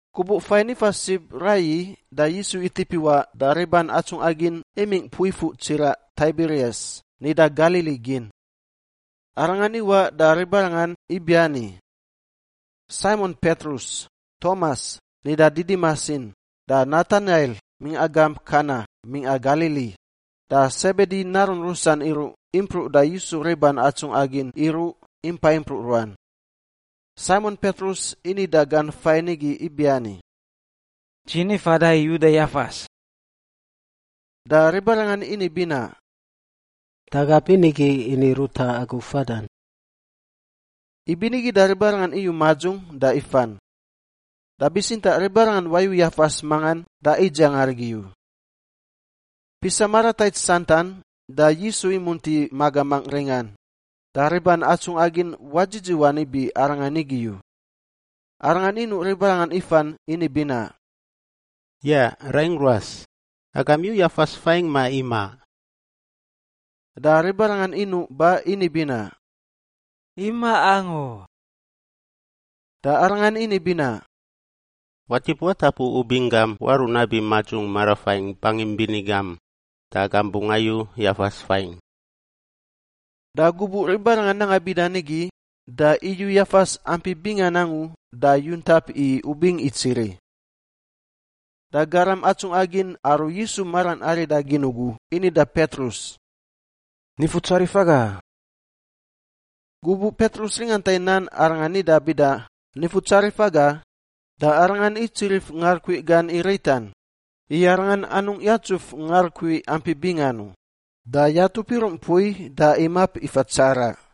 Gubuꞌ fain ifa sib raiyi da Yisu itip iwaꞌ da riban atsungꞌa gin imingꞌ mpui fuꞌ tsiraꞌ Taibirias (nida Galili gin). Arangan iwaꞌ da ribarangan ibiani. Saimon Petrus, Tomas (nida Didimas in) da Natanail mingꞌa gamp Kana mingꞌa Galili, da Sebedi narun rusan iruꞌ impruꞌ da Yisu riban atsungꞌa gin iruꞌ impa impruꞌ ruan. Saimon Petrus ini da gan fain igi ibiani, “Dzi ni fada i uda yafas.” Da ribarangan ini binaꞌ, “Da aga binigi ini ruta agu fadan.” Ibinigi da ribarangan iyu madzung da ifan. Da bitsintaꞌ ribarangan wayu yafas mangan da idziang arigi u. Pisa maratait santan da Yisu imunti magamangꞌ ringan, da riban atsungꞌa gin wadzidziwan ibi Arangan igi u. Arangan inuꞌ ribarangan ifan ini binaꞌ, “Yaꞌ raingꞌ ruas! Agam iyu yafas fain, ma imaꞌ?” Da ribarangan inuꞌ ba ini binaꞌ, “Imaꞌ angu.” Da Arangan ini binaꞌ, “Watip watapu ubing gam waruꞌ nabi madzung marafaingꞌ bangim bini gam da agam bungꞌ ayu yafas faingꞌ.” Da gubuꞌ ribarangan nanga bida nigi, da iyu yafas ampi bingan angu da yuntap i ubing itsiri. Da garam atsungꞌa gin aru Yisu maran arida gin ugu ini da Petrus, “Nifutsarif aga!” Gubuꞌ Petrus ringanta i nan arangan nida bida, “Nifutsarif aga,” da arangan itsirif ngarukui gan i ritan (i arangan anungꞌ yatsuf ngarukui ampi bingan u) da yatup iruꞌ mpui da imap ifa tsaraꞌ.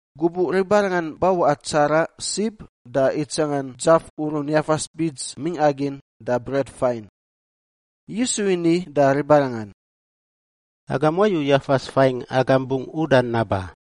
Gubuꞌ ribarangan bawaꞌa tsaraꞌ sib da itsangan dzaf urun yafas bits mingꞌa gin da bret fain. Yisu ini da ribarangan, “Agam wayu yafas faingꞌ agam bungꞌ udan naba.”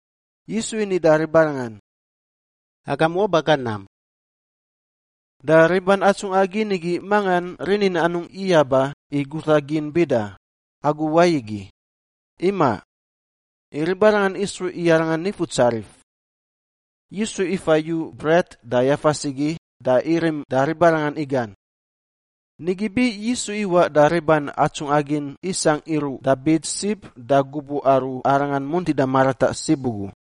Yisu ini da ribarangan, “Agam waba ga nam.” Da riban atsungꞌa gin igi mangan rinin anungꞌ iyaba i guta gin bida, “Agu wai igi?” Imaꞌ. I ribarangan isruꞌ i Arangan Nifutsarif. Yisu ifa yu bret da yafas igi da irim da ribarangan igan. Nigi bi Yisu iwaꞌ da riban atsungꞌa gin isangꞌ iruꞌ da bits sib da gubuꞌ aru Arangan muntida marataꞌ sib ugu.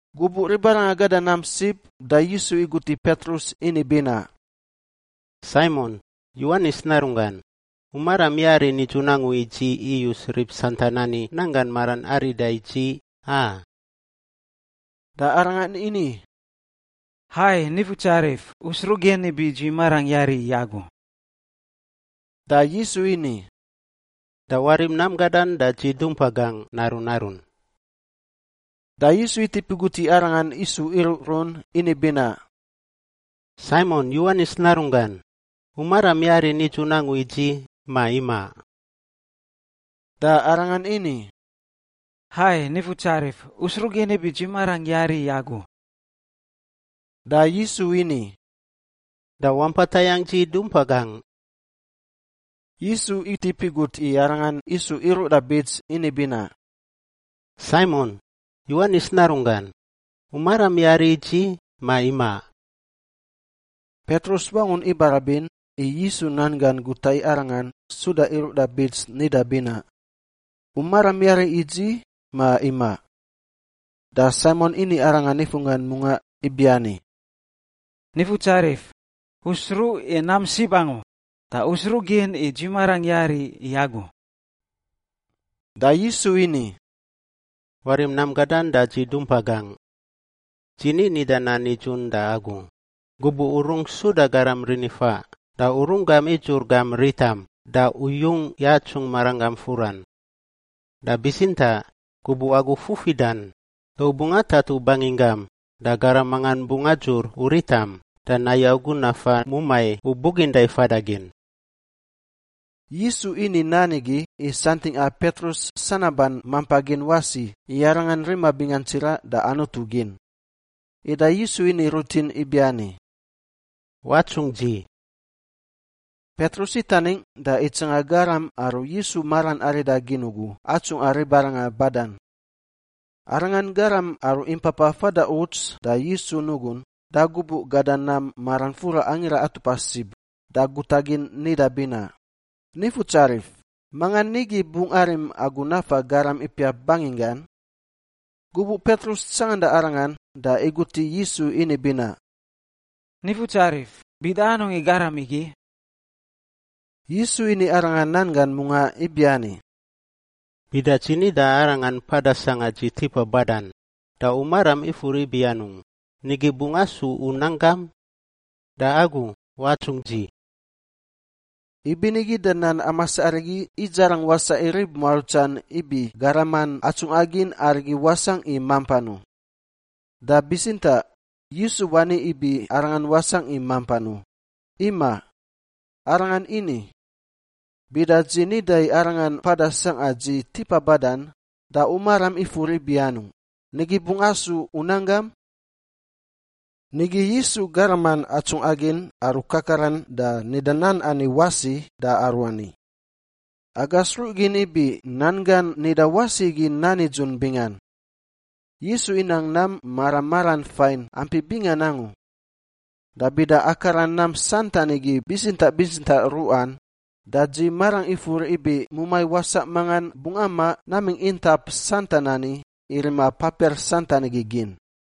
Gubuꞌ ribarangan gada nam sib da Yisu igut i Petrus ini binaꞌ, “Saimon, Yowanis narunggan, u maram yari nidzun angu i dzi iyus rib santan ani nanggan maran arida i dzi, a?” Da arangan ini, “Hai, Nifutsarif, U sruꞌ gin ibi dzi marangꞌ yari i Agu.” Da Yisu ini, “Da warim nam gadan da dzi dumpa gangꞌ narun narun.” Da Yisu itip igut i arangan isu iruꞌrun ini binaꞌ, “Saimon, Yowanis narunggan, u maram yari nidzun angu i dzi, ma imaꞌ?” Da arangan ini, “Hai, Nifutsarif, U sruꞌ gin ibi dzi marangꞌ yari i Agu.” Da Yisu ini, “Da wampa tayangꞌ dzi dumpa gangꞌ.” Yisu itip igut i arangan isu iruꞌ da bits ini binaꞌ, “Saimon, Yowanis narunggan, u maram yari i dzi, ma imaꞌ?” Petrus wangun ibarabin i Yisu nan gan guta i arangan suda iruꞌ da bits nida binaꞌ, “U maram yari i dzi, ma imaꞌ?” Da Saimon ini arangan nifunggan mungaꞌ ibiani, “Nifutsarif, U sruꞌ i nam sib angu, da U sruꞌ gin i dzi marangꞌ yari i Agu.” Da Yisu ini, “Warim nam gadan da dzi dumpa gangꞌ. Dzi ni nida nan nidzun da agu, gubuꞌ u rungꞌ suda garam rinifaꞌ da u runggam idzur gam ritam da u yung yatsung maranggam furan. Da bitsintaꞌ gubuꞌ agu fufidan da u bungꞌ atatu banginggam da garam mangan bungꞌ adzur u ritam da nayu agu nafa mumai u buginda i fada gin.” Yisu ini nan igi i santingꞌa Petrus sanaban mampa gin wasi i arangan rima bingan tsiraꞌ da Anutu gin. Ida Yisu ini rutin ibiani, “Watsungꞌ dzi.” Petrus itaningꞌ da itsanga garam aru Yisu maran arida gin ugu atsungꞌa ribarangan badan. Arangan garam aru impapa fada uts da Yisu nugun da gubuꞌ gada nam maran fura Angira Atupa Sib da guta gin nida binaꞌ, “Nifutsarif, mangan nigi bungꞌ arim Agu nafa garam ipiap banginggan?” Gubuꞌ Petrus tsanganda arangan da igut i Yisu ini binaꞌ, “Nifutsarif, bida anungꞌ i garam igi?” Yisu ini arangan nan gan mungaꞌ ibiani, “Bida dzi nida i arangan mpada sangꞌa dzi tipa badan, da u maram ifur ibi anungꞌ, nigi bungꞌ asu u nanggam? Da agu, watsungꞌ dzi.” Ibinigi da nan amas arigi idzarang wasaꞌ i rib muarutsan ibi garaman atsungꞌa gin arigi wasangꞌ i mampan u. Da bitsintaꞌ Yisu wani ibi arangan wasangꞌ i mampan u, imaꞌ. Arangan ini, “Bida dzi nida i arangan mpada sangꞌa dzi tipa badan, da u maram ifur ibi anungꞌ, nigi bungꞌ asu u nanggam?” Nigi Yisu garaman atsungꞌa gin aru kakaran da nida nan ani wasi da aruani. Aga sruꞌ gin ibi nan gan nida wasi igi nan nidzun bingan. Yisu inang nam mara maran fain ampi bingan angu. Da bida akara nam santan igi bitsintaꞌ bitsintaꞌ ruꞌan, da dzi marangꞌ ifur ibi mumai wasaꞌ mangan bungꞌ amaꞌ namingꞌ intap santan ani i rima papiar santan igi gin.